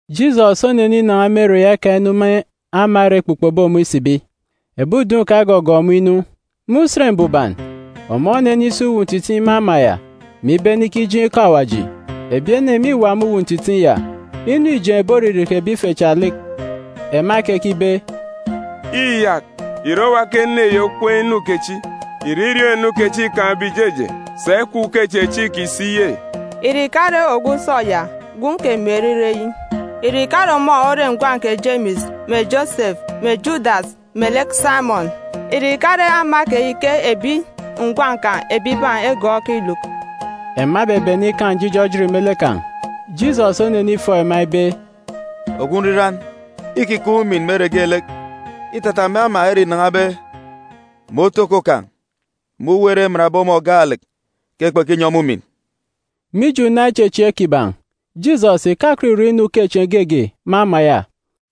Jisọs oneninan̄a me ere ya ika inu me ama ere ekpukpobe ọmọ isibi. Ebi udun̄ kan̄ egọgọọk ọmọ inu. Me Usen Mbuban, ọmọ onenisi uwu ntitiin̄ me ama ya, mè ibene ikijeen̄ ikọ Awaji. Ebi ene mîwa me uwu ntitiin̄ ya. Inu îjeen̄be oririki ebi ife cha lek. Ema ekekibe, “Iyak, ìre owa ke ene yi okween̄ inu kechi? Ìre iriọọn̄-inu kechi îkaan̄be ìjeje? Sà ikwaan̄ ukechieen̄ chi ikisi ye? Ìre ìkare ogwu usọ ya, gwun̄ kè Meri ire eyi? Ìre ìkare ọmọ ore ngwan̄ kè Jemis mè Josefua mè Judas melek Saimọn? Ìre ìkare ama keyi ke ebi ngwan̄ kan̄ ebibaan̄ egọọk iluk?” Ema ebebene ikaan̄ njijọ ejit me lek kan̄. Jisọs onenifọọk ema ibe, “Ogwu nriran îkikaan̄ umin me ere geelek, îtata me ama ere înan̄abe, mè otoko kan̄, mè uwu ere emanbe ọmọ gaalek ke kpekinyi ọmọ umin.” Mije una ichechieek kiban̄, Jisọs ìkakọt ìrọ inu ukechieen̄ geege me ama ya,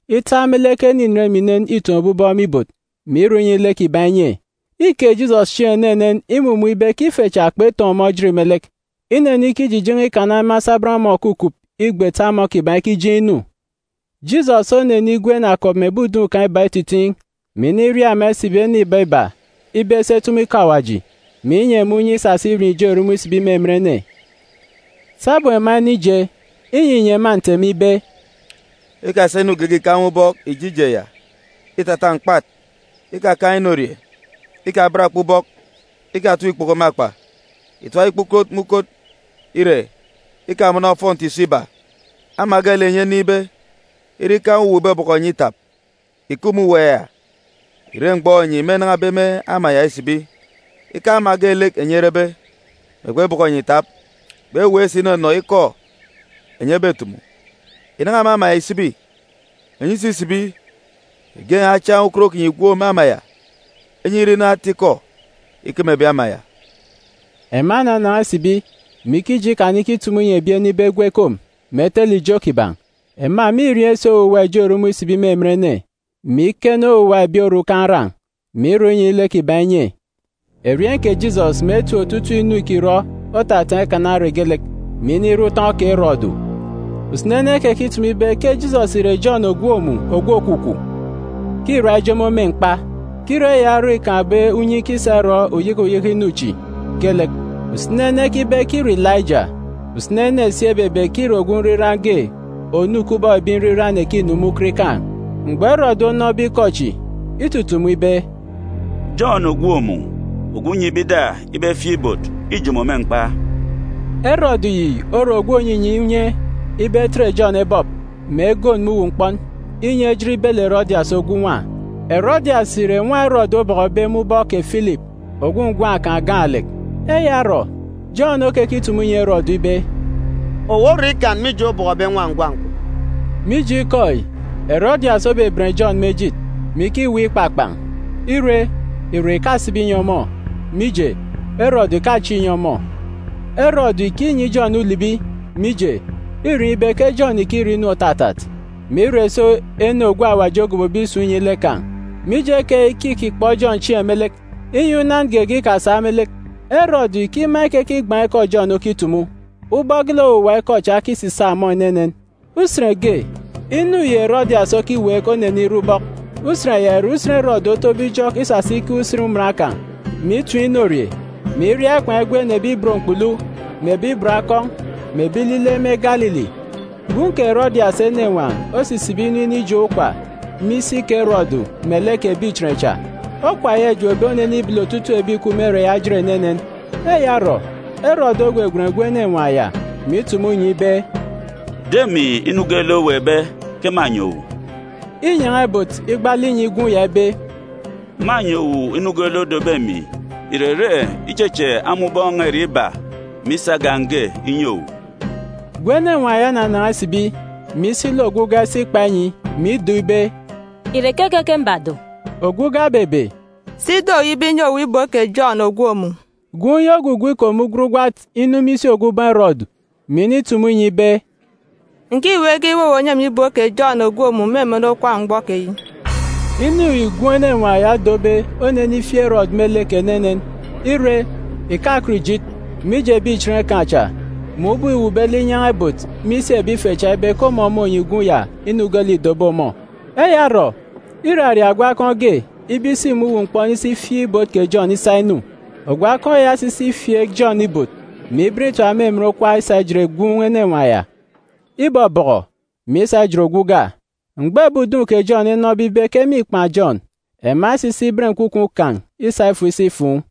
ita me lek ene inen mè inen îtọkọbe aran̄ me ibot, mè irọ inyi lek inye. Îke Jisọs chieen̄ enenen imumun̄ ibe ke ife cha kpekaan̄ ichechieek. Inenikijijen̄e ikana me asabọn ama òkukup igbet ama kiban̄ ikijeen̄ inu. Jisọs onigwen akọp mè ebi udun̄ kan̄ iba ititiin̄, mè iniria ema isibi, ene iba iba, ibe esi etumu ikọ Awaji, mè inyi ema unye isasa irieen̄ ijo erumun̄ isibi me emen ene. Sabum ema enije, inyinyi ema nteme ibe, “Ikasa inu geege ìkaan̄ me ubọk ìje ije ya, îtata mkpat. Ikakaan̄ inorie, ikaben akpa ubọk, ikatap ikpoko me akpa. Ìtap ikpukot me ukot, ire, ikamọnọ ofọnti ìso iba. Ama geelek enyi enin̄be, ire ikaan̄ uwu òbọbọkọ enyi itap, ìkup me uwu ya ìre mgbọ enyi mênan̄abe me ama ya isibi. Ikaan̄ ama geelek enyi erebe, mè kpebọkọ enyi itap, kpeweek si inọnọ ikọ enyi ebetumu, ìnan̄a me ama ya ìsibi. Enyi isisibi, ìgen̄ achiaan̄ ukot kinyi ìgwook me ama ya, inyi ire inu ata-ikọ ikeme ebi ama ya.” Ema enanan̄a isibi, mè ikije ikana ikitumu inyi ebi ene ibe egwu ekom, mè etele ijo kiban̄. Ema mîrieen̄ si owuwa ijo erumun̄ isibi me emen ene, mè iken owuwa ebi orukan̄ aran̄, mè irọ inyi lek kiban̄ inye. Erieen̄ kè Jisọs mè etip otutuuk inu îkirọ otataan̄ ikana ere geelek, mè inire utọn̄ kè Erọdu. Usini ene ekekitumu ibe ke Jisọs ìre Jọn ògwook mun̄ ogwu òkwukwu; ke îra ijomo me mkpa; ke îre eya orọ îkaan̄be unye ikisa irọ uyeke uyeke inu chi geelek. Usini ene ekibe ke îre Ilaija. Usini ene si ebebe ke îre ogwu nriran ge onu kubọk ebi nriran ekinu me ukot ikaan̄. Mgbọ Erọdu onọbe ikọ chi, itutumu ibe, “Jọn ògwook mun̄ ogwu nnyibe ida ibe efieek ibot, îjomo me mkpa.” Erọdu yi ore ogwu ònyinyi unye ibe etet Jọn ebọp, mè egon me uwu mkpọn, inyi ejit ibele Erọdias ogwu nwa. Erọdias ìre nwa Erọdu obọkọbe me ubọk kè Filip, ogwu ngwan̄ kan̄ gaalek. Eya orọ, Jọn okekitumu inyi Erọdu ibe, “Owu orọn̄ ikan, mije obọkọbe nwa ngwan̄ kwun̄.” Mije ikọ yi, Erọdias obeben Jọn me ejit, mè ikiweek ikpakpan̄. Ire, irek ìkasibi ìnyi ọmọ, mije, Erọdu ìkachieek inyi ọmọ. Erọdu îkinyi Jọn ulibi, mije, îriọọn̄ ibe ke Jọn ìkirọ inu òtatat, mè ire si ene ogwu Awaji ogobobe isun̄ inyi lek kan̄. Mije keyi ke îkikpọ Jọn chieen̄ me lek, inyi unan geege ikasak me lek. Erọdu îkima ikekigban̄ ikọ Jọn okitumu, ubọk geelek owuwa ikọ cha okisisaak ọmọ enenen. Usen ge, inu yi Erọdias okiweek onenire ubọk. Usen ya ìre usen Erọdu otobe ijọk isasa ikeek usen iman kan̄, mè item inorie, mè iria ikwaan̄ igwen ebi ibot mkpulu, mè ebi ibot akọn̄, mè ebi ilile me Galili. Gwun̄ kè Erọdias enenwaan̄ osisibi inu inijop okwa me isi kè Erọdu melek ebi ichen cha. Okwa ya îjopbe onenibele otutuuk ebi ìkup me ere ya ejit enenen. Eya orọ, Erọdu ogwegwen gwun̄ enenwaan̄ ya, mè itumu inyi ibe, “Do emi inu geelek oweekbe, ke mânyi owu.” Înyan̄a ibot igbaalek inyi gwun̄ ya ibe, “Mânyi owu inu geelek odobe emi, ìrere icheche ama ubọọn̄ n̄a irek iba, mè isa agan̄ ge inyi owu.” Gwun̄ enenwaan̄ ya onanan̄a isibi, mè isi lek ogwu uga isi ikpa inyi, mè ido ibe, “Ìre keke ke mbado?” Ogwu uga obebe, “Do ibe inyi owu ibot kè Jọn ògwook mun̄.” Gwun̄ yi ogwugwu ikom ugwat ugwat inu me isi ogwu ubọọn̄ Erọdu, mè initumu inyi ibe, “Ǹkiweek ibe owu ònyi emi ibot kè Jọn ògwook mun̄ me emen okwa mgbọ keyi.” Inu yi gwun̄ enenwaan̄ ya odobe onenifieek Erọdu me lek enenen. Ire, ìkakọt ìjit, mije ebi ichen kan̄ cha, mè ubọk îwuukbe lek inyan̄a ibot me isi ebi ife cha ibe ke ọmọ mônyi gwun̄ ya inu geelek îdobe ọmọ. Eya orọ, iraria ogwu akọn̄ ge ibe isi me uwu mkpọn isi ifieek ibot kè Jọn isa inu. Ogwu akọn̄ ya osisi ifieek Jọn ibot, mè iben itap me emen okwa isa ijet gwun̄ enenwaan̄ ya. Ibọbọkọ, mè isa ijet ogwu uga. Mgbọ ebi udun̄ kè Jọn enọbe ibe ke mîkpan̄ Jọn, ema esisi iben nkwukwu kan̄ isa ifo isi ifuun̄.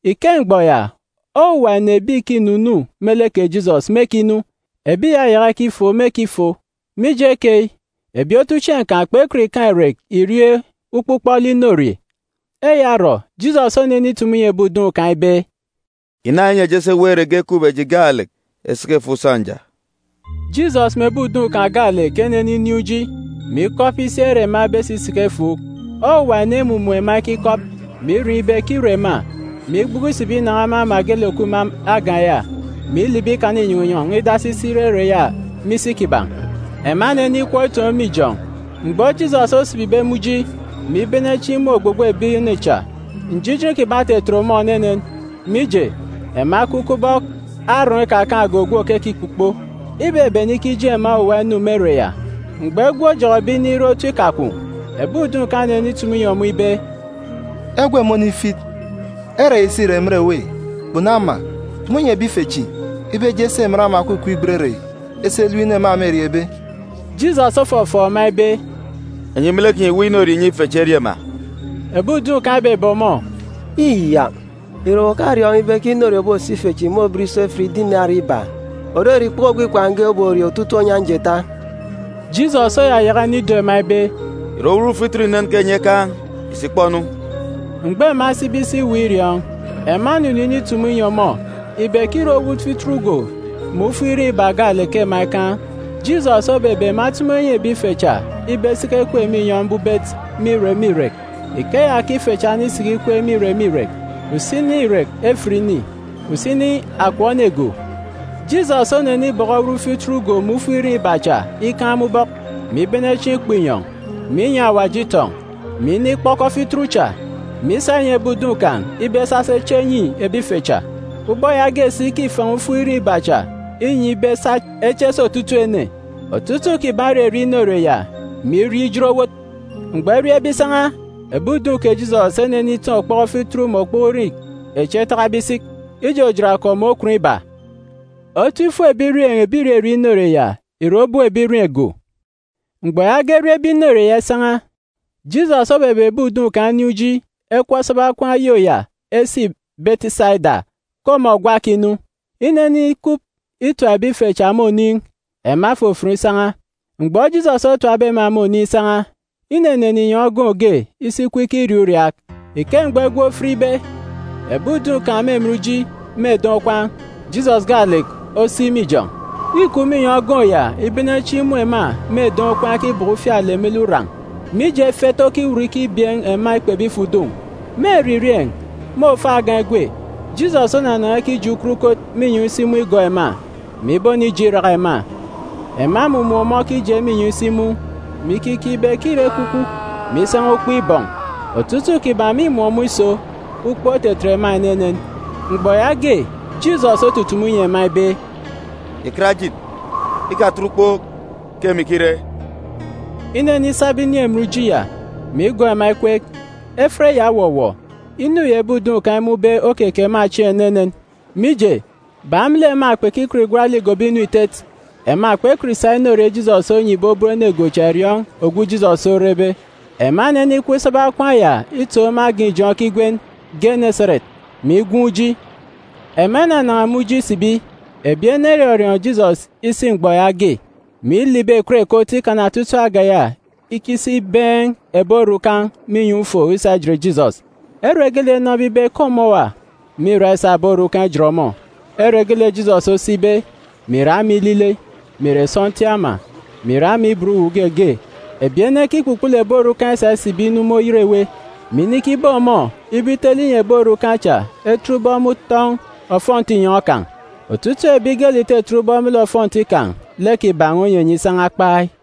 Ike mgbọ ya, owuwa ene ebi ìkinunu me lek kè Jisọs mêkinu, ebi ìyayaka ikifofon mêkifon. Mije keyi, ebi otuchieen̄ kan̄ kpekọt ikaan̄ irek irie ukpọk ukpọk lek inorie. Eya orọ, Jisọs onenitumu inyi ebi udun̄ kan̄ ibe, “Ìna, inyi eji esi eweek ere ge ekup eji gaalek esiki efuuk sọnja.” Jisọs mè ebi udun̄ kan̄ gaalek eneninin̄ uji, mè ikọp isi ere ema ebesi isiki efuuk. Owuwa ene emumun̄ ema ekikọp, mè iriọọn̄ ibe ke îre ema, mè igbuku isibi inan̄a me ama geelek òkup me agan̄ ya, mè ilibi ikana inyọn̄ inyọn̄ idasi isi ire ere ya me isi kiban̄. Ema enenikọp itoon̄ me ijọn̄. Mgbọ Jisọs osibibe me uji, mè ibene chieen̄ imun̄ ogbogbo ebi ene cha, njijin kiban̄ otetet ọmọ enenen, mije, ema ekup kubọk arọọn̄ ikakaan̄ge ogwu òkekikpukpo. Ibebene ikijeen̄ ema owuwa inu me ere ya. Mgbọ egwe ojọkọbe inire otu ikakwun̄, ebi udun̄ kan̄ enenitumu inyi ọmọ ibe, “Egwe mônifit, ere yi si ìre emen èwê, kpunu ama. Tumu nyi ebi ife chi ibe eje esi emen ama òkukup igbet ere yi esi elep inu ema mêriebe.” Jisọs ofọfọọk ema ibe, “Enyi me lek kinyi ìweek inorie ìnyi ife chi erie ma.” Ebi udun̄ kan̄ ebebe ọmọ, “Iyak! Ìre owu òkariọọn̄ ibe ke inorie òboso ife chi môben iso efit dinari iba (òrere ikpoko ogwu ikwaan̄ uko ge oborie otutuuk onyan̄ jeeta)?” Jisọs oyayaka inido ema ibe, “Ìre owut fituru inen ke enyi ekaan̄? Ìsi ìkpọ-nu.” Mgbọ ema esibe isi iweek iriọọn̄, ema enunu initumu inyi ọmọ ibe ke îre owut fituru go mè ufuk irin̄ iba gaalek ke ema ekaan̄. Jisọs obebe ema etumu enyi ebi ife cha ibe esiki ekweek me inyọn̄ mbubet me irek me irek. Ikeya ke ife cha enisiki ikweek me irek me irek, usini irek efit ene, usini akọp ene go. Jisọs onenibọkọ owut fituru go mè ufuk irin̄ iba cha ikaan̄ me ubọk, mè ibene chieen̄ ikpọ inyọn̄, mè inyi Awaji itọn̄, mè inikpọkọ fituru cha, mè isa inyi ebi udun̄ kan̄ ibe esa esi eche enyi ebi ife cha. Ubọk yaage si ke îfan̄a ufuk irin̄ iba cha inyi ibe esa eche eso otutuuk ene. Otutuuk kiban̄ ererie inorie ya, mè irie ijot owot. Mgbọ eriebe isan̄a, ebi udun̄ kè Jisọs eneniteen̄ okpọkọ fituru mè okpọkọ irin̄ echi etakabe isik, ijojot akọp mè okwun iba. Otu ifuk ebirieen̄ ebi ìrerie inorie ya ìre obop ebirieen̄ go. Mgbọ yaage eriebe inorie ya isan̄a, Jisọs obebe ebi udun̄ kan̄ enin̄ uji ekọp esaba okwaan̄ oyô ya esi Betisaida ke ọmọ gwa òkinu. Inenikup itap ebi ife cha me oniin̄, ema efofon isan̄a. Mgbọ Jisọs otapbe ema me oniin̄ isan̄a, inenene inyọn̄ ogoon̄ ge isi ikup ikiriaak uriaak. Ike mgbọ egwe ofitbe, ebi udun̄ kan̄ me emen uji me eden̄ okwaan̄, Jisọs gaalek osik me ijọn̄. Îkup me inyọn̄ ogoon̄ ya ibene chieen̄ imun̄ ema me eden̄ okwaan̄ ekibọkọ ufialek me lek uran̄, mije efet okiwut ikibieen̄ ema ikpebe ifo udun̄. Me eririeen̄, me òfo agan̄ egwe, Jisọs onanan̄a ikije ukot ukot me inyọn̄ isi mun̄ igọọk ema, mè ibonije iraka ema. Ema emumun̄ ọmọ okije me inyọn̄ isi mun̄, mè ikikeek ibe ke îre ekwukwu, mè isan̄a ukpo ibọn̄. Otutuuk kiban̄ mîmun̄ ọmọ iso, ukpook otetet ema enenen. Mgbọ yaage, Jisọs otutumu inyi ema ibe, “Ìkat ejit, ikatet ukpook, ke emi ke îre.” Inenisaba inin̄ emen uji ya, mè igọọk ema ikweek. Efet ya owọwọ. Inu yi ebi udun̄ kan̄ emun̄be okeke ema chieen̄ enenen. Mije, bak me lek ema kpekikọt igwat lek igobo inu itet, ema kpekọt isa inorie Jisọs onyibe obop ene go cha iriọọn̄ ogwu Jisọs orebe. Ema enenikọp isaba okwaan̄ ya itoon̄ me agan̄ ijọn̄ ekigwen Geneseret, mè igwuun̄ uji. Ema inanan̄a me uji isibi, ebi ene erọriọọn̄ Jisọs isi mgbọ yaage, mè ilibi ekot ekot ikana otutuuk agan̄ ya ikisi ibeen̄ ebi orukan̄ me inyọn̄ ufo isa ijet Jisọs. Ere geelek enọbe ibe ke ọmọ òwa, mîra isa ebi orukan̄ ijet ọmọ. Ere geelek Jisọs osibe, mè ìre ama ilile, mè ìre sọntiik ama, mè ìre ama ibot uwu ge ge, ebi ene ekikpukpulu ebi orukan̄ isa isibi inu me oyet ewe, mè inikibeek ọmọ ibe itele inyi ebi orukan̄ cha etet ubọk me utọn̄ ofọnti inyọn̄ kan̄. Otutuuk ebi geelek ìtetet ubọk me lek ofọnti kan̄, lek kiban̄ onyenye isan̄a kpai.